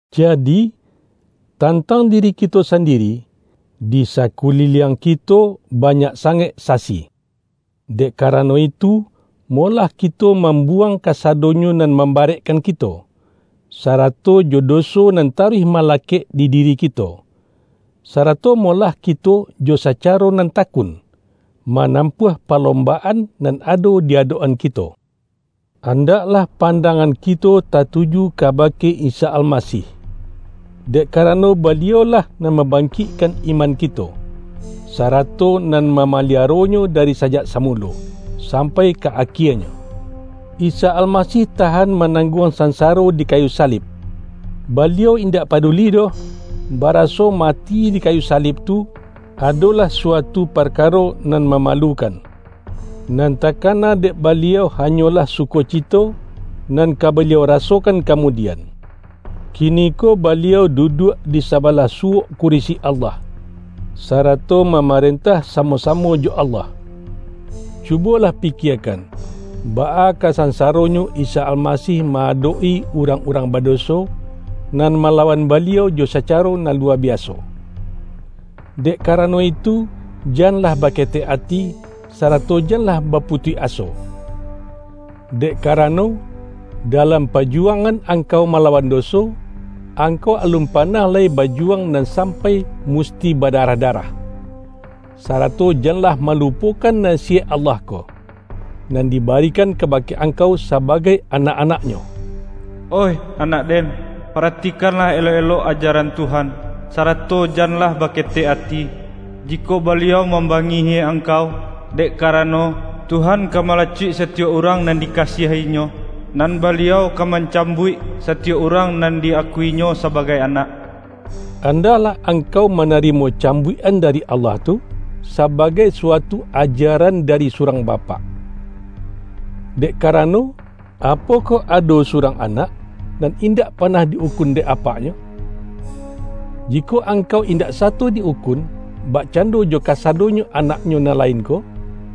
Jadi, tantang diri kito sandi-ri, di sakuliliang kito banyak sangaik sasi! Dek karano itu, mo-lah kito mambuwang kasadonyo nan mambarekkan kito, sarato jo doso nan taruih malakek di diri kito. Sarato molah kito jo sacaro nan takun, ma-nampuah palombaan nan ado di adok-an kito. Andaklah pandangan kito tatuju kabake Isa Almasih, dek ka-rano Baliau-lah nan mambangkikkan iman kito, sarato nan mamaliaronyo dari sajak samulo, sampai ka akie-nyo. Isa Almasih tahan manangguang sansaro di kayu salib! Baliau indak paduli doh, baraso mati di kayu sa-lib tu, adolah suatu parkaro nan ma-malukan. Nan takana dek Baliau hanyolah sukocito, nan ka Baliau ra-sokan kamudian. Kiniko Baliau du-duak di sabalah suwok kurisi Allah, sarato mamarentah samo-samo jo Allah. Cubolah pikiekan, baa ka sansa-ronyo Isa Almasih ma-adok-i urang-urang badoso, nan malawan Baliau jo sacaro nan luwa biaso! Dek kara-no itu, janlah baketek ati, sarato jan-lah baputuih aso. Dek karano, dalam pajuwangan angkau malawan doso, angkau alun panah lai bajuwang nan sampai musti badarah-darah. Sarato janlah malupokan nasiyaik Allah ko, nan dibarikan kabake angkau sabagai anak-anak-Nyo:”Oih anak Den, paratikanlah elok-elok ajaran Tuhan, sarato janlah baketek ati, jikok Baliau mambangihi angkau. Dek karano, Tuhan ka malacuik satiyok urang nan dikasiahi-Nyo, nan Baliau ka mancambuik, satiyok urang nan di-akui-Nyo sabagai anak.” Andaklah angkau manarimo cambuik-an dari Allah tu, sabagai suatu ajaran dari surang bapak. Dek karano, apokoh ado surang anak, nan indak panah di-ukun dek apaknyo? Jikok angkau indak sato di-ukun, bakcando jo kasadonyo anaknyo nan lain ko,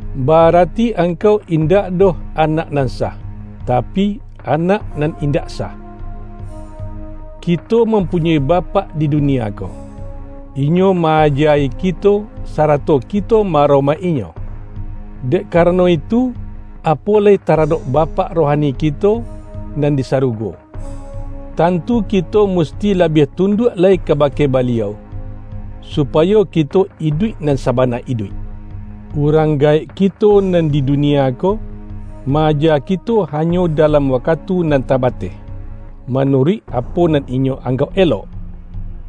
ba-arati angkau indak doh anak nan sah, tapi, anak nan indak sah. Kito mampunyoi bapak di dunia ko. Inyo ma-aja-i kito, sarato kito ma-aromaik-inyo. Dek karano itu, apo lai taradok Bapak rohani kito nan di sa-rugo, tantu kito musti labiah tunduak lai kabake Baliau, supayo kito iduik nan sabana iduik. Urang gaek kito nan di dunia ko, ma-aja kito hanyo dalam wakatu nan tabateh, manuruik apo nan inyo anggauk elok.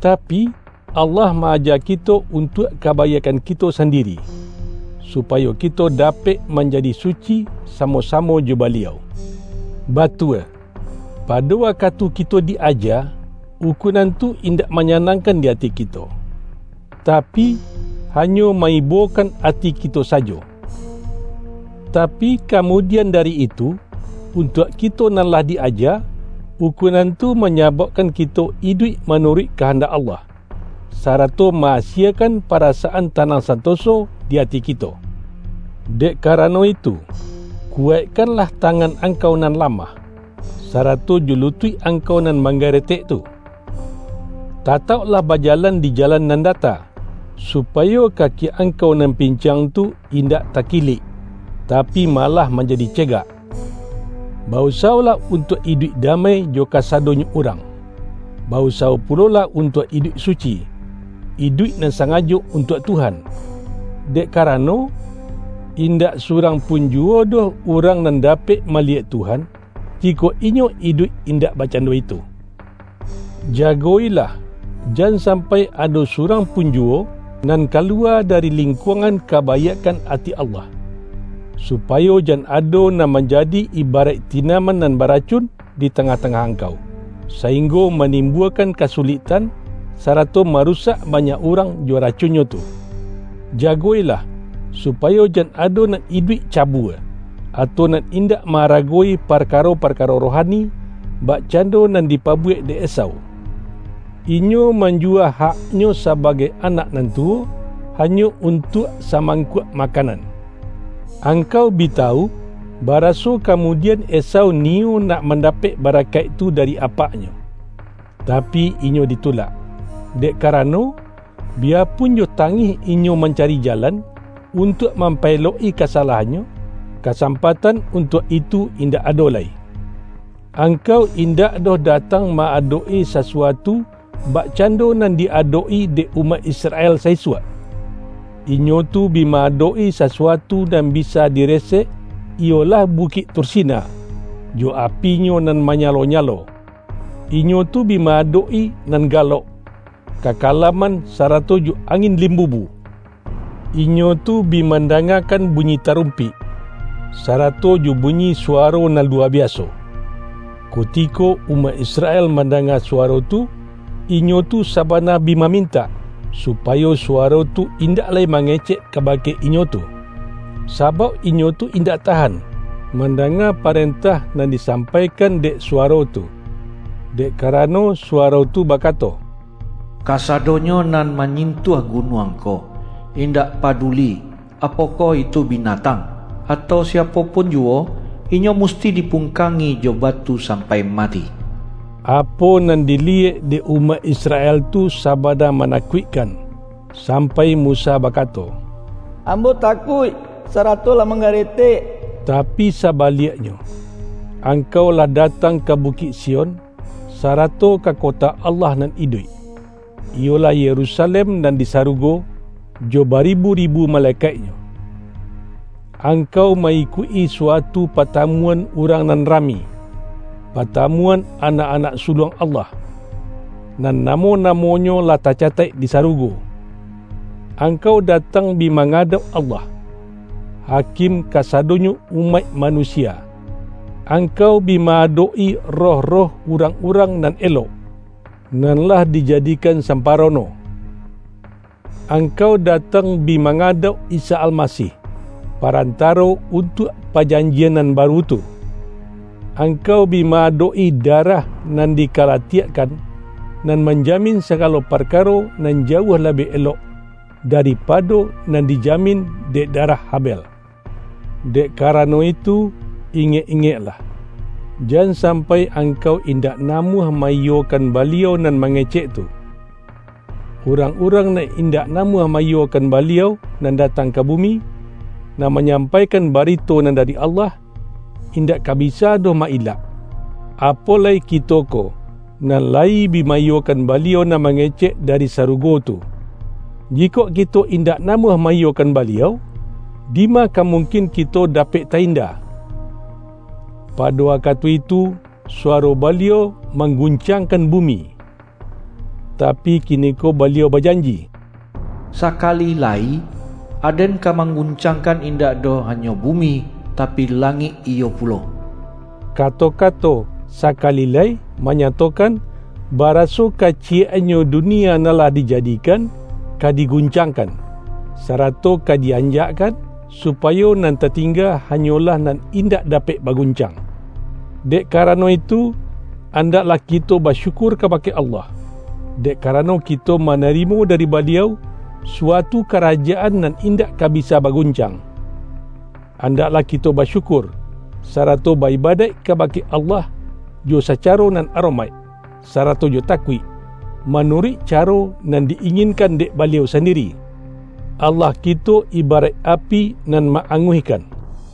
Tapi, Allah ma-aja kito untuak kabaiakkan kito sandiri, supayo kito dapek manjadi suci samo-sa-mo jo Baliau. Batua, pado wakatu kito di-aja, ukunan tu indak manyanangkan di ati kito, tapi, hanyo ma-ibokan ati ki-to sajo. Tapi, kamudian dari itu, untuak kito nan lah di-aja, ukunan tu manya-baukkan kito iduik manuruik kahandak Allah, sarato ma-asiekan parasaan ta-nang santoso di ati kito. Dek karano itu, kuwaikkanlah ta-ngan angkau nan lamah, sarato jo lutuik angkau nan manggaretek tu! Tatauk-lah bajalan di jalan nan data, supayo kaki angkau nan pincang tu indak taki-lik, tapi malah manjadi cegak. Ba-usawolah untuak iduik damai jo kasadonyo urang. Ba-usawo pulolah untuak iduik suci, iduik nan sanga-jo untuak Tuhan. Dek karano, indak surang pun juwo doh urang nan da-pek maliyek Tuhan, jikok inyo iduik in-dak bakcando itu. Jago-ilah, jan sam-pai ado surang pun juwo, nan kaluwa dari lingkuangan kabaiakkan ati Allah, supayo jan ado nan manjadi ibaraik ti-naman nan baracun, di tangah-tangah angkau, sainggo manimbuakan kasulik-tan, sarato marusak banyak urang jo ra-cunnyo tu. Jago-ilah, supayo jan ado nan iduik cabua, atau nan indak ma-aragowi parkaro-parkaro rohani, bak-cando nan dipabuwek dek Esau. Inyo manjuwa haknyo sabagai anak nan tu-wo, hanyo untuak samangkuak makan-an. Angkau bi tawu, baraso kamudi-an Esau niyo nak mandapek barakaik tu dari apaknyo, tapi inyo ditulak. Dek ka-rano, biyapun jo tangih inyo mancari ja-lan, untuak mampaelok-i kasalahannyo, kasampatan untuak itu indak ado lai. Angkau indak doh datang ma-adok-i sasuatu, bakcando nan di adok-i dek umaik Israel sa-isuak. Inyo tu bi ma-adok-i sasuatu nan bisa diresek, iyolah Bukik Tursina, jo apinyo nan ba-nyalo-nyalo; inyo tu bi ma-adok-i nan galok, kakalaman sarato jo angin lim-bubu; inyo tu bi mandangakan bunyi tarumpik, sarato jo bunyi suwaro nan luwa biaso. Kutiko umaik Israel man-danga suwaro tu, inyo tu sabana bi ma-mintak, supayo suwaro tu indak lai ma-ngecek kabake inyo tu. Sabauk inyo tu indak tahan, mandanga parentah nan disampaikan dek suwaro tu. Dek karano suwaro tu bakato,”Kasadonyo nan manyintuah gunuang ko, indak pa-duli, apokoh itu binatang, atau siapo pun juwo, inyo musti dipungkangi jo batu sampai mati.” Apo nan diliyek dek umaik Israel tu sabana manakuik-kan, sampai Musa bakato,”Ambo ta-kuik sarato lah manggaretek!” Tapi sabaliaknyo, angkau lah da-tang ka Bukik Sion, sarato ka kota Allah nan iduik, iyolah Yerusalem nan di sarugo jo baribu-ribu malekaiknyo. Angkau ma-ikuik-i suatu patamuan urang nan rami — patamuan anak-anak suluang Allah, nan namo-namonyo lah tacataik di sarugo. Angkau datang bi mangadauk Allah, Hakim kasadonyo umaik manusia. Angkau bi ma-adok-i roh-roh urang-urang nan elok, nan lah dijadikan samparono. Angkau da-tang bi mangadauk Isa Almasih, Pa-rantaro untuak pajanjian nan baru tu; angkau bi ma-adok-i darah nan dika-latiakkan, nan manjamin sagalo par-karo nan jauah labiah elok, daripado nan dijamin dek darah Habel. Dek karano itu, ingek-ingeklah, jan sampai angkau indak namuah ma-iyo-kan Baliau nan mangecek tu. Urang-urang nan indak namuah ma-iyokan Baliau nan datang ka bumi, nan ma-nyampaikan barito nan dari Allah, in-dak ka bisa doh ma-ilak. Apo lai kito ko, nan layi bi ma-iyokan Baliau nan ma-ngecek dari sarugo tu! Jikok kito in-dak namuah ma-iyokan Baliau, dima ka mungkin kito dapek ta-inda! Pa-do wakatu itu, suwaro Baliau manggun-cangkan bumi. Tapi kiniko Baliau bajan-ji,”Sakali lai, Aden ka mangguncangkan indak doh hanyo bumi, tapi langik iyo pulo.” Kato-kato”sakali lai” manya-tokan, baraso kaciyek-annyo dunia nan lah dijadikan, ka diguncangkan, sarato ka di-anjakkan, supayo nan tatingga ha-nyolah nan indak dapek baguncang. Dek karano itu, andaklah kito ba-syukur kabake Allah, dek karano ki-to manarimo dari Baliau, suatu karajaan nan indak ka bisa baguncang. Andaklah kito basyukur, sarato ba-ibadaik kabake Allah, jo sacaro nan aromaik, sarato jo takuik, manuruik caro nan di-inginkan dek Baliau sandiri. Dek karano, Allah kito ibaraik api nan ma-anguihkan.